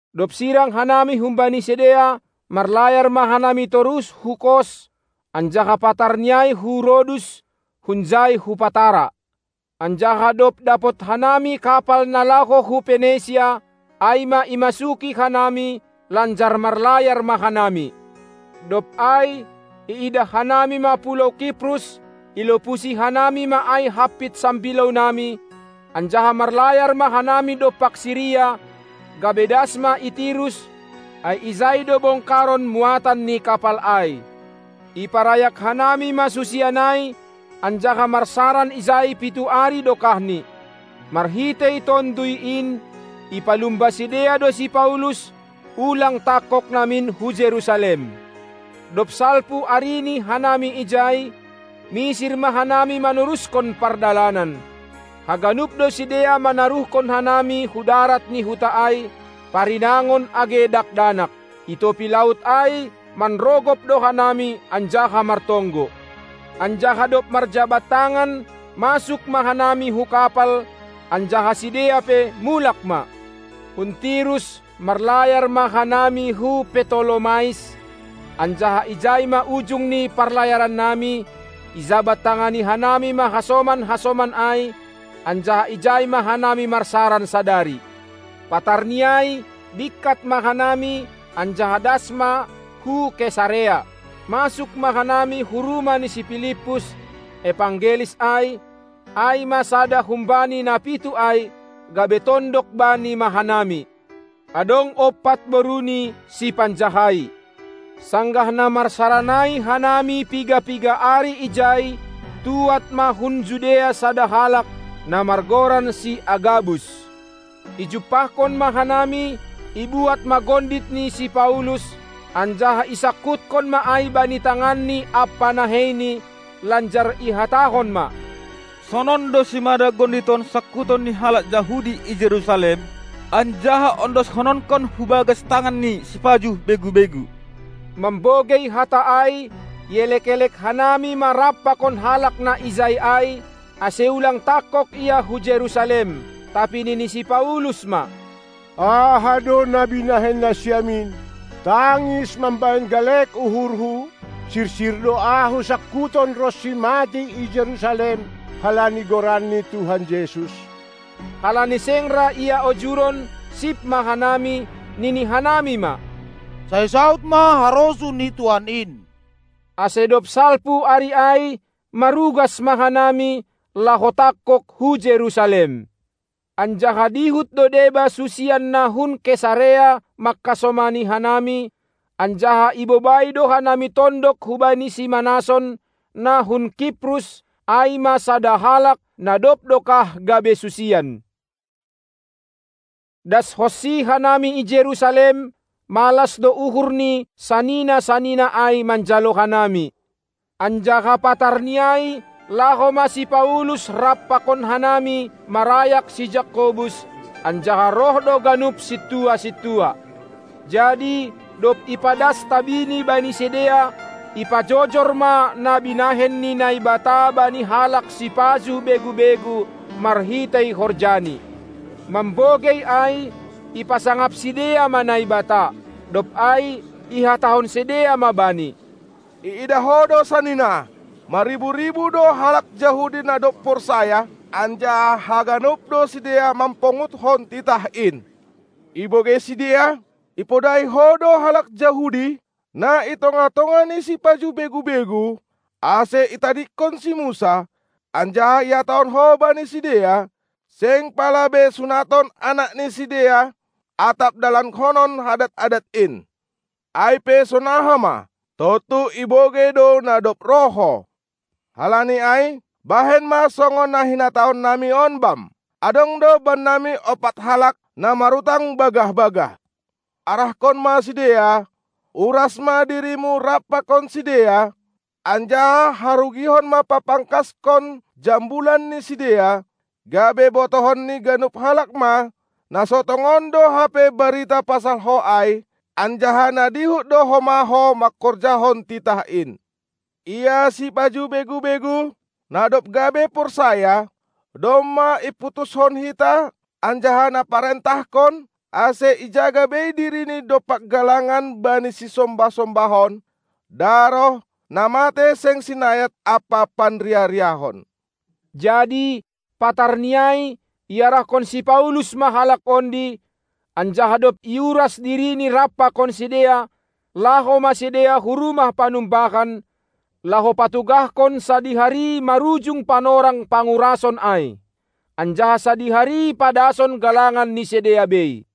Dob sirang hanami humbani sidea, marlayar ma hanami torus hu Kos, anjaha patarni ai hu Rodus, hunjai hu Patara. Anjaha dob dapot hanami kapal na laho hu Penesia, ai ma imasuki hanami, lanjar marlayar ma hanami. Dob ai iidah hanami ma pulou Kiprus, ilopusi hanami ma ai hampit sambilounami, anjaha marlayar ma hanami dompak Siria, gabe das ma i Tirus; ai ijai do bongkaron muatan ni kapal ai. Iparayak hanami ma susian ai anjaha marsaran ijai pitu ari dokahni. Marhitei Tonduy in ipalumba sidea do si Paulus, ulang tangkog namin hu Jerusalem. Dob salpu arini hanami ijai, misir ma hanami manorushon pardalanan. Haganup do sidea manaruhkon hanami hu darat ni huta ai, parinangon age dakdanak. I topi laut ai manrogop do hanami anjaha martonggo. Anjaha dob marjabat tangan, masuk ma hanami hu kapal, anjaha sidea pe mulak ma. Hun Tirus marlayar ma hanami hu Ptolomais; anjaha ijai ma ujung ni parlayarannami; ijabat-tangani hanami ma hasoman-hasoman ai, anjaha ijai ma hanami marsaran sadari. Patarni ai bingkat ma hanami, anjaha das ma hu Kesarea. Masuk ma hanami hu rumah ni si Pilippus, evangelis ai, ai ma sada humbani na pitu ai, gabe tondok bani ma hanami. Adong ompat boruni, sipanjahai. Sanggah na marsaran ai hanami piga-piga ari ijai, tuad ma hun Judea sada halak, na margoran si Agabus. Ijumpahkon ma hanami, ibuat ma gondit ni si Paulus, anjaha isangkuthon ma ai bani tanganni ampa naheini, lanjar ihatahon ma: Sonon do simada gondit on sangkuton ni halak Jahudi i Jerusalem, anjaha ondoshononkon hu bagas tangan ni sipajuh begu-begu. Mambogei hata ai, ielek-elek hanami ma rap pakon halak na ijai ai, ase ulang tangkog ia hu Jerusalem. Tapi nini si Paulus ma: Aha do na binahen nasiam in, tangis mambahen galek uhurhu? Sirsir do ahu sangkuton ronsi matei i Jerusalem halani Goran ni Tuhan Jesus. Halani seng ra ia ojuron, sip ma hanami, nini hanami ma: Sai saud ma harosuh ni Tuhan in! Ase dob salpu ari ai, marugas ma hanami, laho tangkog hu Jerusalem. Anjaha dihut do deba susian na hun Kesarea mangkasomani hanami, anjaha ibobai do hanami tondok hubani si Manason, na hun Kiprus, ai ma sada halak na dob dokah gabe susian. Daskonsi hanami i Jerusalem, malas do uhur ni sanina-sanina ai manjalo hanami. Anjaha patarni ai laho ma si Paulus rap pakon hanami marayak si Jakobus, anjaha roh do ganup sintua-sintua. Jadi dob ipadas tabini bani sidea, ipajojor ma na binahen ni Naibata bani halak sipajuh begu-begu marhitei horjani. Mambogei ai ipasangap sidea ma Naibata. Dob ai ihatahon sidea ma bani: Iidah ho do sanina, marribu-ribu do halak Jahudi na dob porsaya, anjaha haganup do sidea mamponguthon titah in. Ibogei sidea, ipodahi ho do halak Jahudi, na i tongah-tongah ni sipajuh begu-begu, ase itadingkon si Musa, anjaha ihatahon ho bani sidea, seng pala be sunaton anak ni sidea atap dalankonon adat-adat in. Ai pe sonaha ma? Tontu ibogei do na dob roh ho. Halani ai bahen ma songon na hinatahonnami on bam! Adong do bannami ompat halak, na marutang bagah-bagah. Arahkon ma sidea, uras ma dirimu rap pakon sidea, anjaha harugihon ma papangkashon jambulan ni sidea, gabe botohon ni haganup halak ma, na so tongon do hape barita pasal ho ai, anjaha na dihut do homa ho mangkorjahon titah in. Ia sipajuh begu-begu, na dob gabe porsaya, domma iputushon hita anjaha na parentahkon, ase ijaga bei dirini dompak galangan bani sisombah-sombahon, daroh, na matei seng sinayat ampa panriah-riahon. Jadi patarni ai iarahkon si Paulus ma halak ondi, anjaha dob iuras dirini rap pakon sidea, laho ma sidea hu rumah panumbahan, laho patugahkon sadihari marujung panorang pangurason ai, anjaha sadihari padason galangan ni sidea bei.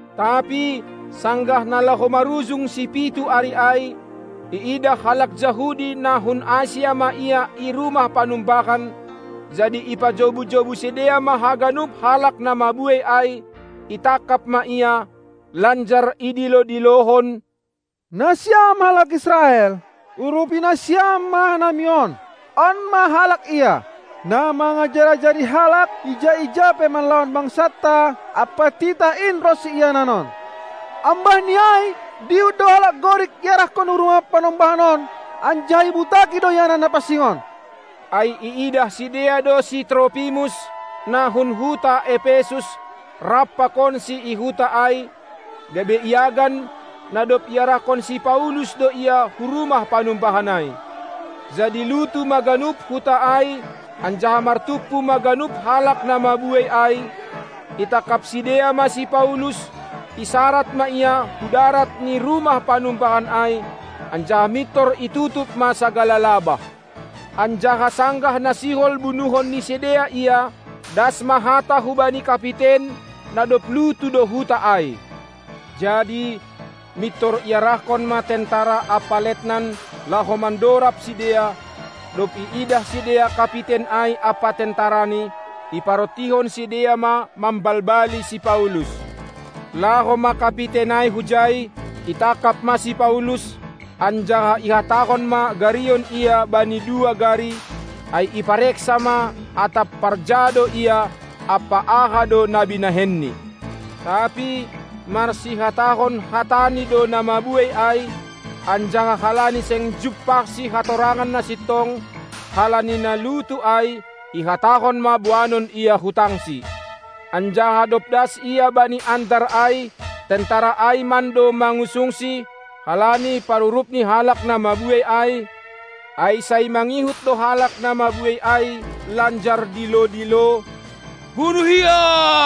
Tapi sanggah na laho marujung sipitu ari ai, iidah halak Jahudi na hun Asia ma ia i rumah panumbahan, jadi ipajobu-jobu sidea ma haganup halak na mabuei ai, itangkap ma ia, lanjar idilo-dilohon: Nasiam halak Israel, urupi nasiam ma hanami on! On ma halak ia, na mangajar-ajari halak ija-ija pe manlawan bangsanta, ampa titah in ronsi ianan on. Ambahni ai dihut do halak Gorik iarahkon hu rumah panumbahan on, anjaha ibutaki do ianan na pansing on! Ai iidah sidea do si Tropimus, na hun huta Epesus rap pakonsi i huta ai, gabe iagan, na dob iarahkon si Paulus do ia hu rumah panumbahan ai. Jadi lutu ma ganup huta ai, anjaha martumpu ma ganup halak na mabuei ai; itangkap sidea ma si Paulus, isarad ma ia hudarat ni rumah panumbahan ai, anjaha mintor itutup ma sagala labah. Anjaha sanggah na sihol bunuhon ni sidea ia, das ma hata hubani kapiten, na dob lutu do huta ai. Jadi mintor iarahkon ma tentara ampa letnan, laho mandorab sidea; dob iidah sidea kapiten ai ampa tentarani, iparontihon sidea ma mambalbali si Paulus. Laho ma kapiten ai hujai, itangkap ma si Paulus, anjaha ihatahon ma garion ia bani dua gari; ai ipareksa ma atap parja do ia ampa aha do na binahenni. Tapi marsihatahon hatani do na mabuei ai; anjaha halani seng jumpahsi hatorangan na sintong, halani na lutu ai, ihatahon ma boanon ia hu tangsi. Anjaha dob das ia bani andar ai, tentara ai mando mangusungsi, halani parurup ni halak na mabuei ai, ai sai mangihut do halak na mabuei ai, lanjar dilo-dilo: Bunuh ia!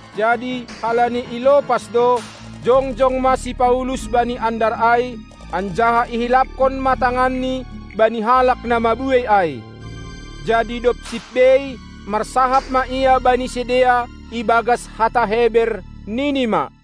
Jadi halani ilopas do, jongjong ma si Paulus bani andar ai, anjaha ihilaphon ma tanganni bani halak na mabuei ai. Jadi dob sip bei, marsahap ma ia bani sidea ibagas hata Heber, nini ma: